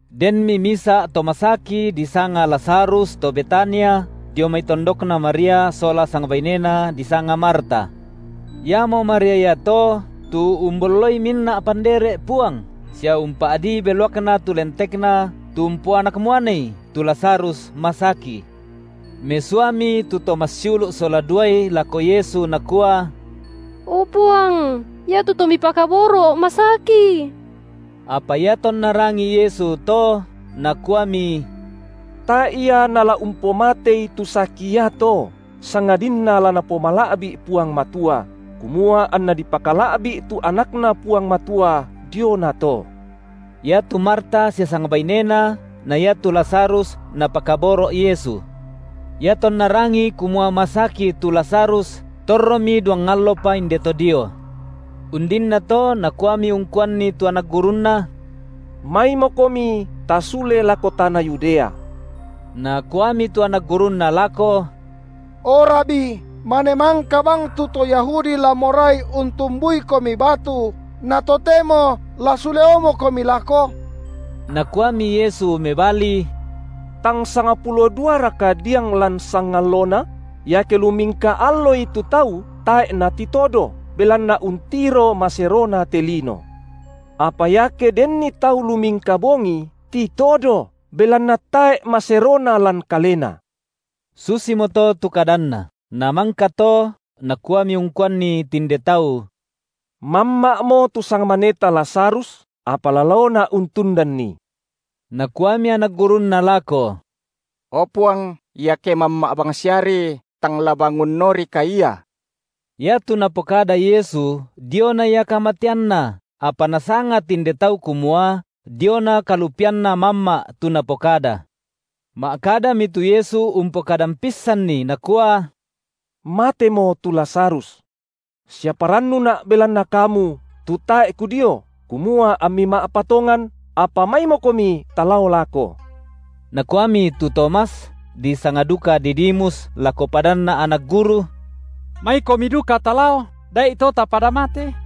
Denmi misa’ to masaki disanga Lazarus to Betania, dio mai tondokna Maria sola sangbainena, disanga Marta. Iamo Maria iato tu umbolloi minna’ pandere’ Puang, sia umpa’dii beluakna tu lentekNa tu umpoanak muanei tu Lazarus masaki. Mesuami tu to massiulu’ sola duai lako Yesu nakua: O Puang, iatu to Mipakaboro’, masaki. Apa iatonna rangii Yesu to, Nakuami: Tae’ ia nala umpomatei tu saki iato, sangadinna la Napomala’bi’ Puang Matua, kumua anNa dipakala’bi’ tu AnakNa Puang Matua diona to. Iatu Marta sia sangbainena na iatu Lazarus Napakaboro’ Yesu. Iatonna rangii kumua masaki tu Lazarus, torromi duang allopa inde to dio. Undinnato Nakuami ungkuanni tu anak gurunNa: Maimokomi tasule lako tana Yudea. Nakuami tu anak gurunNa lako: O Rabi, mane mangka bang tu to Yahudi la morai untumbuiKomi batu, na totemo la suleomoKomi lako? Nakuami Yesu mebali: Tang sangpulo duaraka diang lan sangallona? Iake lumingka alloi tu tau, tae’ natitodo, belanna untiro maserona te lino. Apa iake denni tau lumingka bongi, titodo, belanna tae’ maserona lan kalena. Susimoto tu kadanNa; namangka to Nakuami ungkuanni tinde tau: Mamma’mo tu sangmaneta Lazarus, apa la laoNa’ untundanni. Nakuami anak gurunNa lako: O Puang, iake mamma’ bangsiari, tang la bangunorika ia. Iatu Napokada Yesu diona ia kamateanna, apa nasanga tinde tau kumua diona kalupianna mamma’ tu Napokada. Ma’kadami tu Yesu umpokadan pissanni Nakua: Matemo tu Lazarus. Sia parannuNa’ belanna kamu, tu tae’ Kudio, kumua ammi ma’patongan; apa maimokomi talao lako. Nakuami tu Tomas, disanga duka Didimus lako padanna anak guru: Maikomi duka talao, da’ito tapada mate.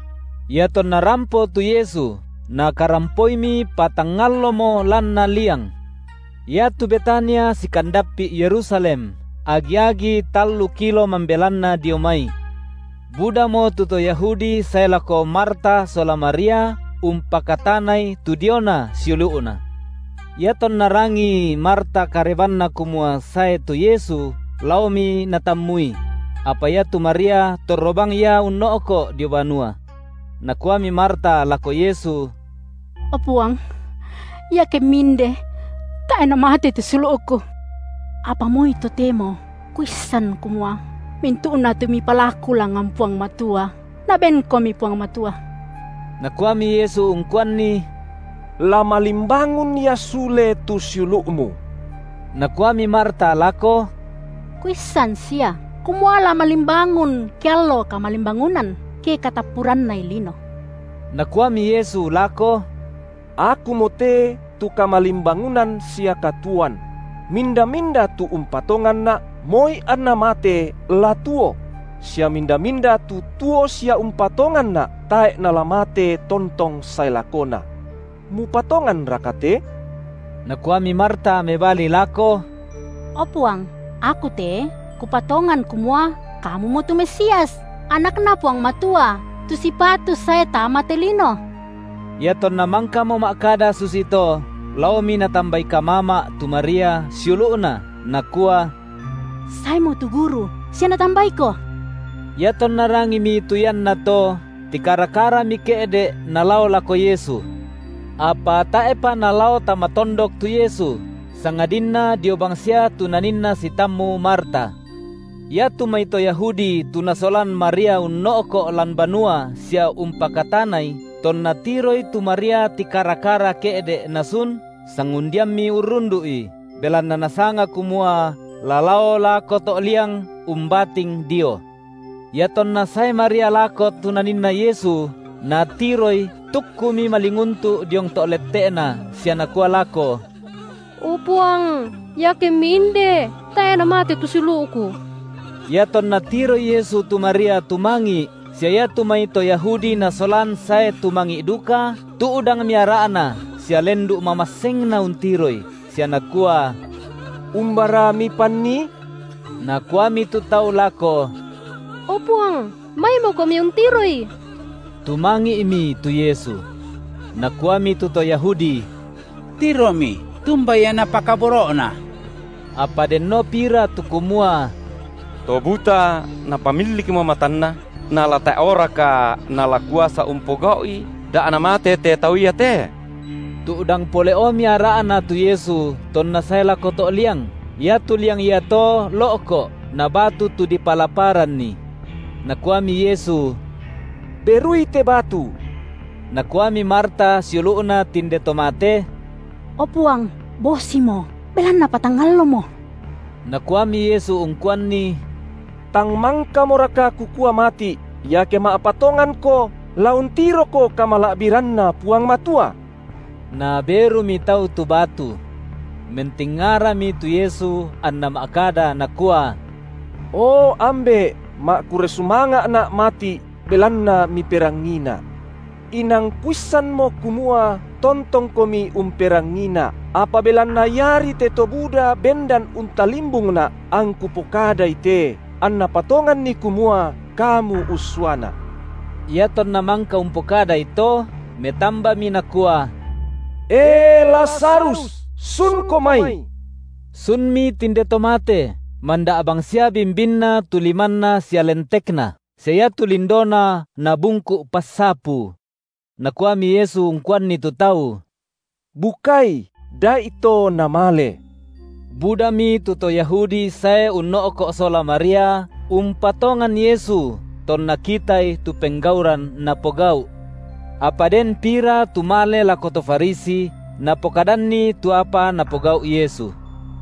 Iatonna rampo tu Yesu, Nakarampoimi patang allomo lanna liang. Iatu Betania sikandappi’ Yerusalem, agi-agi tallu kilo mambelanna dio mai. Budamo tu to Yahudi sae lako Marta sola Maria umpakatanai tu diona siulu’na. Iatonna rangii Marta karebanna kumua sae tu Yesu, laomi natammui; apa iatu Maria torro bang ia unno’ko’ dio banua. Nakuami Marta lako Yesu: O Puang, iakemMi inde, tae’ namate tu siulu’ku. Apa moi totemo kuissan kumua, mintu’na tu Mipalaku langngan Puang Matua, NabenKomi Puang Matua. Nakuami Yesu ungkuanni: La malimbangun ia sule tu siulu’mu. Nakuami Marta lako: Kuissan sia, kumua la malimbangun ke allo kamalimbangunan, ke katappurannai lino. Nakuami Yesu lako: Akumote tu kamalimbangunan sia katuoan; minda-minda tu umpatonganNa’, moi anna mate, la tuo; sia minda-minda tu tuo sia umpatonganNa’, tae’ nala mate tontong sae lakona. Mupatonganraka te? Nakuami Marta mebali lako: O Puang, aku te kupatongan kumua Kamumo tu Mesias, AnakNa Puang Matua, tu sipatu sae tama te lino. Iatonna mangkamo ma’kada susito, laomi natambai kamama’ tu Maria, siulu’na, nakua: Saemo tu Guru sia Natambaiko. Iatonna rangimi tu iannato, tikara-karami ke’de’ nalao lako Yesu. Apa tae’pa nalao tama tondok tu Yesu, sangadinna dio bangsia tu Naninna sitammu Marta. Iatu mai to Yahudi tu nasolan Maria unno’ko’ lan banua sia umpakatanai, tonna tiroi tu Maria tikara-kara ke’de’ nasun, sangundiammi urrundu’i, belanna nasanga kumua la lao lako to’ liang umbating dio. Iatonna sae Maria lako tu Naninna Yesu, natiroI, tukkumi malinguntu’ diong to’ lette’Na sia nakua lako: O Puang, iakemMi inde, tae’ namate tu siulu’ku. Iatonna tiroi Yesu tu Maria tumangi’, sia iatu mai to Yahudi nasolan sae tumangi’ duka, tu’dangmi ara’Na sia lendu’ mamassengNa untiroi, sia nakua: Umbara mipannii? Nakuami tu tau lako: O Puang, maimoKomi untiroi. Tumangi’mi tu Yesu. Nakuami tu to Yahudi: Tiromi tumba ia Napakaboro’na! Apa denno pira tu kumua: To buta Napamillikmo matanna, nala tae’oraka Nala kuasa umpogau’i da’ namate te tau iate? Tu’dang pole’omi ara’Na tu Yesu tonna sae lako to’ liang. Iatu liang iato lo’ko’, nabatu tu dipalaparanni. Nakuami Yesu: Berui te batu. Nakuami Marta siulu’na tinde to mate: O Puang, bosimo, belanna patang allomo. Nakuami Yesu ungkuanni: Tang mangkamoraka Kukua mati’, iake ma’patonganko la untiroko kamala’biranNa Puang Matua? Naberumi tau tu batu. Mentingarami tu Yesu anNa ma’kada Nakua. O Ambe’, ma’kurre sumanga’Na’ mati’, belanna MiperangiiNa’. Inang Kuissanmo kumua tontongKomi umperangiiNa’, apa belanna iari te to buda bendan untalimbungNa’, angKu pokadai te, anna patonganni kumua Kamu ussuaNa’. Iatonna mangka umpokadai to, metambami Nakua: E Lazarus, sunko mai! Sunmi tinde to mate, manda’ bangsia bimbinna tu limanna sia lentekna, sia iatu lindona nabungku’ passapu. Nakuami Yesu ungkuanni tu tau: Bukai, da’ito namale. Budami tu to Yahudi sae unno’ko’ sola Maria, umpatongan Yesu tonna kitai tu penggauran Napogau’. Apa den pira tu male lako to Farisi, napokadanni tu apa Napogau’ Yesu.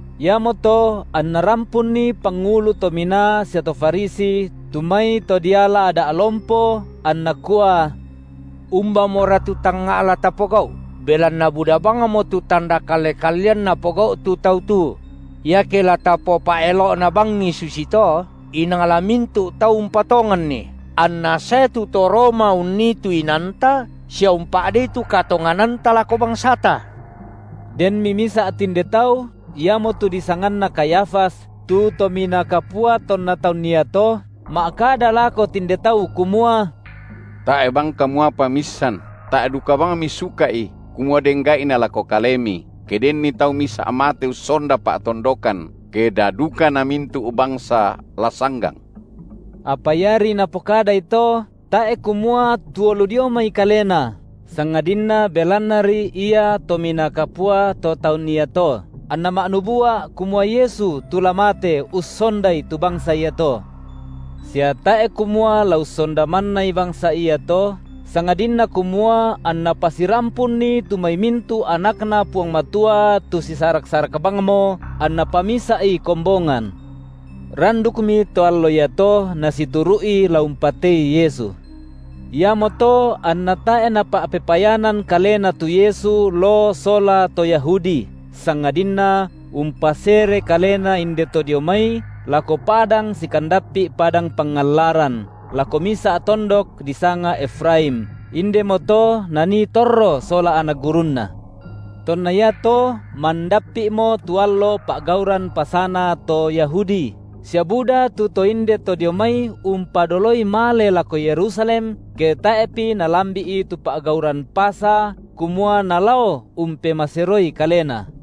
Iamoto anna rampunni pangulu to minaa sia to Farisi tu mai to diala Ada’ lompo, anna kua: Umbamora tu tangnga’ la tapogau’, belanna buda bangmo tu tanda kalle-kallean Napogau’ tu Tau tu? Iake la tapopa’elo’na bangi susi to, inang la mintu’ tau umpatonganNi, anna sae tu to Roma unnii tu inanta sia umpa’dei tu katongananta lako bangsata. Denmi misa’ tinde tau, iamotu disanganna Kayafas, tu Tominaa Kapua tonna taun iato, ma’kada lako tinde tau kumua: Tae’ bang kamu apa miissan, tae’ duka bang misuka’i kumua den gai’na lako kalemi, ke denni tau misa’ mate ussonda pa’tondokan, ke da duka namintu’ bangsa la sanggang. Apa iari napokadai to, tae’ kumua tuo lu dioi mai kalena, sangadinna belannari ia Tominaa Kapua to taun iato, anna ma’nubua’ kumua Yesu tu la mate ussondai tu bangsa iato. Sia tae’ kumua la ussonda mannai bangsa iato, sangadinna kumua anNa pasirampunni tu mai mintu’ anakNa Puang Matua tu sisarak-sarak bangmo anNa pamisa’i kombongan. Randukmi to allo iato nasituru’i la umpatei Yesu. Iamoto anna tae’ Napa’pepayanan Kalena tu Yesu loo sola to Yahudi, sangadinna umpasere Kalena inde to dio mai lako padang sikandappi’ padang pangallaran, lako misa’ tondok disanga Efraim, indemo to Nanii torro sola anak gurunNa. Tonna iato mandappi’mo tu allo pa’gauran Pasana to Yahudi, sia buda tu to inde to dio mai umpadoloi male lako Yerusalem ke tae’pi nalambi’i tu pa’gauran Pasa, kumua nalao umpemaseroi kalena.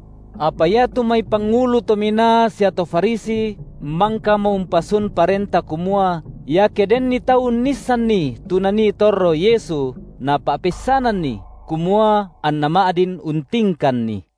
Apa iatu mai pangulu to minaa sia to Farisi mangkamo umpasun parenta kumua, iake denni tau unnissanni tu nanii torro Yesu, napa’peissananni, kumua anna ma’din untingkanNi.